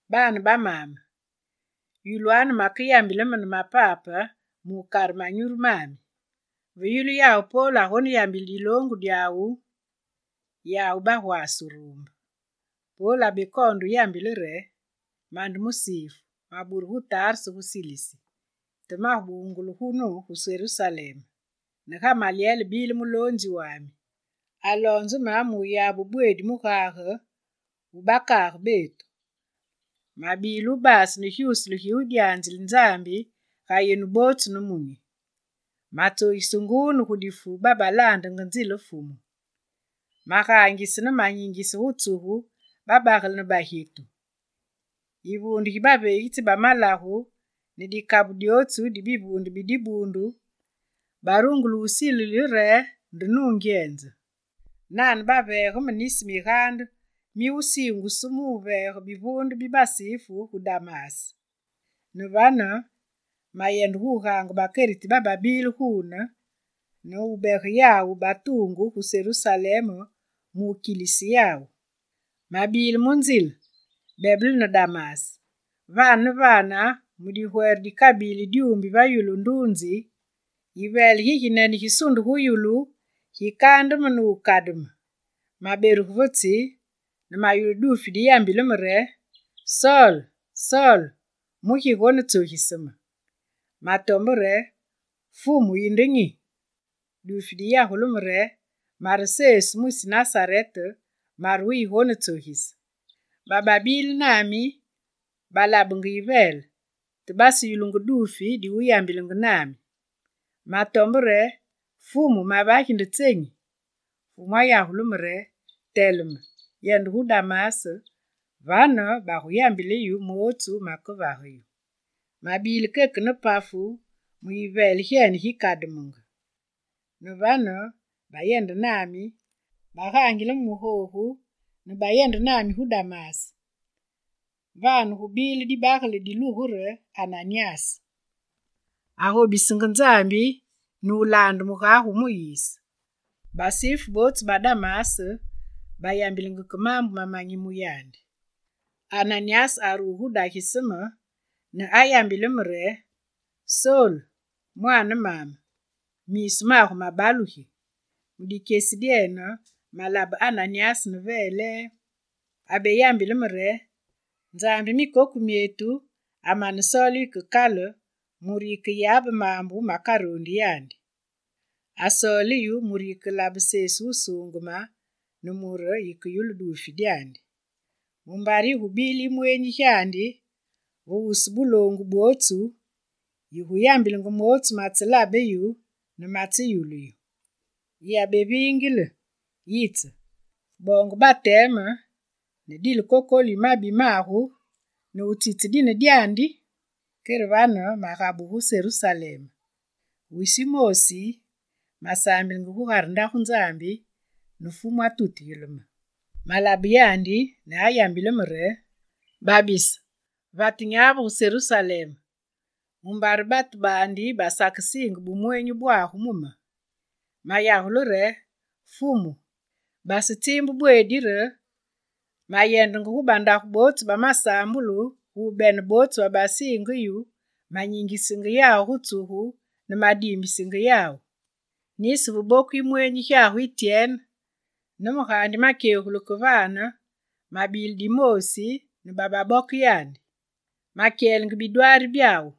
«Baane ba maame, yulwanu makeyambile me ne mapape mu wukare nyurwami.» Ve yulu yawu Pol agoneyambile gu diloongu dyawu, yawu bagwaase wuruumbe. Pol abekoonde wuyambile re: «Mande musifu. Maburu gu Tarse gu Silisi, te mabungulu gunu, gu Serusalem, ne Gamalyel bile muloonzi wami. Aloonze me mu wuyabe bweedi mugage wu bakaage betu. Mabile wubase ne gyuusule gi wudyanzile Nzambi ga yenu bootsu nemunyi. Matsogise nguu ne gu difu babalaandenge nzile Fumu. Magaangise ne manyingise gu tsugu babagele ne bagyetu. Yivuunde gi baveegitsi ba malagu ne dikabu dyootsu di bivuunde bi dibuundu barungule wusilile re nde nungyenze. Nane, baveege me nisi migaande mi wusiingusu mu wuveege bivuunde bi basifu gu Damas. Ne vane, mayende gu gaange bakeriti bababile guune, ne wubege yawu batuungu gu Serusalem mu wukilise yawu. Mabile mu nzile, bebele ne Damas. Vane ne vane mu digwere dikabili dyuumbi va yulu nduunzi, yiveele giginene gisunde gu yulu, gikaande me ne wukademe. Maberuge va tsi ne mayulu duufi diyambilenge me re: “Sol, Sol, mugi yigonetsogise me?” Matombe re: “Fumu, yinde nyi?” Duufi diyagule me re: “Mare Sesu mwisi Nasarete, mare wuyigonetsogise.” Bababile nami balabenge yiveele, te baseyulungu duufi di wuyambilenge nami. Matombe re: “Fumu mavagi nde tsenyi?” Fumu ayagule me re: “Teleme, yende gu Damas, vane, baguyambile yu mootsu makevage yu.” Mabile keke ne pafu mu yiveele gyene gikademenge. Ne vane, babayendenge nami, bagaangile me mu googu, ne bayende nami gu Damas. «Vane, gubile dibagele dilugungu re Ananyas. Agobisenge Nzambi ne wulaande mugage wu Muyise. Basifu bootsu ba Damas bayambilenge ke maambu mamanyi mu yandi. Ananyas ayitse gu dagise me ne ayambile me re: “Sol, mwaane maame, miisu magu mabalugi!” Mu dikyesi dyene, malabe Ananyas ne velee. Abeyambile me re: “Nzambi mikoku myetu amane wusoole yu ke kale mure yikeyabe maambu makarondi yandi. Asoole yu mure yikelabe Sesu wusuungeme, ne mure yikeyulu duufi dyandi. Mumbare yigubile yimweenyi gyandi, ve wusu buloongu bwootsu, yiguyambilenge mootsu matselabe yu ne matseyulu yu. Yiyabeviingile, yitse, boonge bateme ne dile kokolu yi mabi magu nutsitse dine dyandi!” Kere vane magabugu gu Serusalem. Wisi wumoosi, masaambilenge gugare Ndagu Nzambi, ne Fumu atutugile me. Malabe yandi ne ayambile me re: “Babise, vate nyavu gu Serusalem! Mumbare batu baandi basakesiinge bumweenyi bwagu mu me.” Mayagule re: “Fumu, basetsiimbu bweedi re, mayendenge gu bandagu bootsu ba masaambulu gu wubene bootsu babasiinge yu, manyingisenge yawu gu tsugu ne madiimbisenge yawu. Nisi ve boku yimweenyi gyagu Ityene, ne me gaandi makyegulu vane, mabile dimoosi ne bababoke yandi. Makyelenge bidwaari byawu.”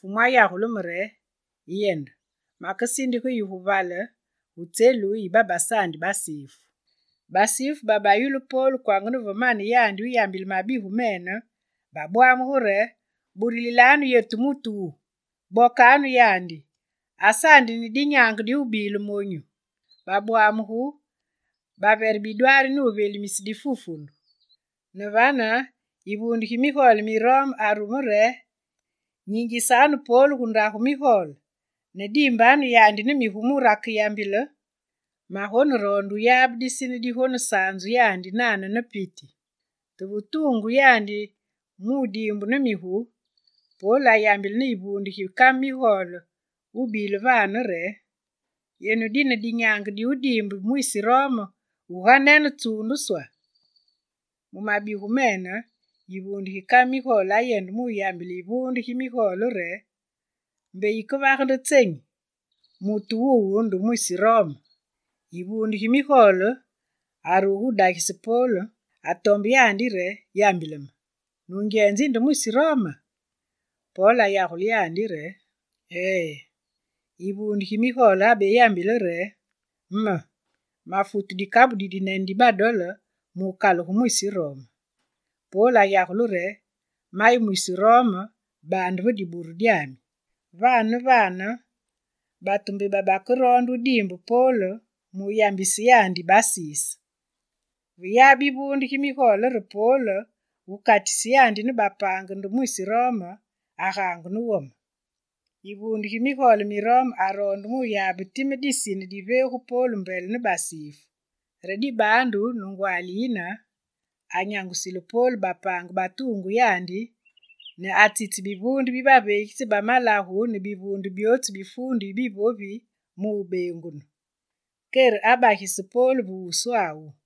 Fumu ayambile me re: “Yende, makesindige yu gu vale, gu tselu yi babasaandi basifu.”» Basifu babayulu Pol kwanga ne ve mane yandi wuyambile mabigu mene, babwamugu re: «Burulilanu yetu mutu wu! Bokanu yandi! Asaandi ne dinyaange diwubile monyu!» Babwamugu, bavere bidwaari ne wuvelimise difufundu. Ne vane yivuunde gi migole mi Rome arume re: «Nyingisanu Pol gu ndagu migole ne diimbanu yandi ne migu mure akeyambile! Magoneroonde wuyabe disine digonesaanzu yandi nane ne piti.» Te ve tuungu yandi mu wudiimbu ne migu, Pol ayambile ne yivuunde gi kame migole wubile vane re: «Yenu dine dinyaange di wudiimbe mwisi Rome wuganene tsuunduswa?» Mu mabigu mene, yivuunde gi kame migole ayende gu wuyambile yivuunde gi migole re: «Mbe yikevage nde tsenyi! Mutu wuwu nde mwisi Rome!» Yivuunde gi migole aruge mu wudagise Pol, atombe yandi re: «Yambile me, nungyenze yinde mwisi Roma?» Pol ayagule re: «Ee.» Yivuunde gi migole abeyambile re: «Me, mafute dikabu didinene di badole mu wukalugu mwisi Rome.» Pol ayagule re: mayi mwisi Rome baande ve diburu dyami!» Vane ne vane batu mbe babakeroonde wudiimbe Pol mu wuyambise yandi basise; ve yabe yivuunde gi migole re Pol wukatise yandi ne bapaange nde mwisi Rome, agaangu ne wome. Yivuunde gi migole mi Rome aroonde wuyabe time disine diveegu Pol mbele ne basifu. Re dibaandu ne ngwaali yine, anyangulise Pol bapaange batuungu yandi ne atsitse bivuunde bi baveegitsi bamalagu ne bivuunde byootsu bi fuundu yi bivovi mu wubeengunu. Kere abagise Pol ve wuswawu.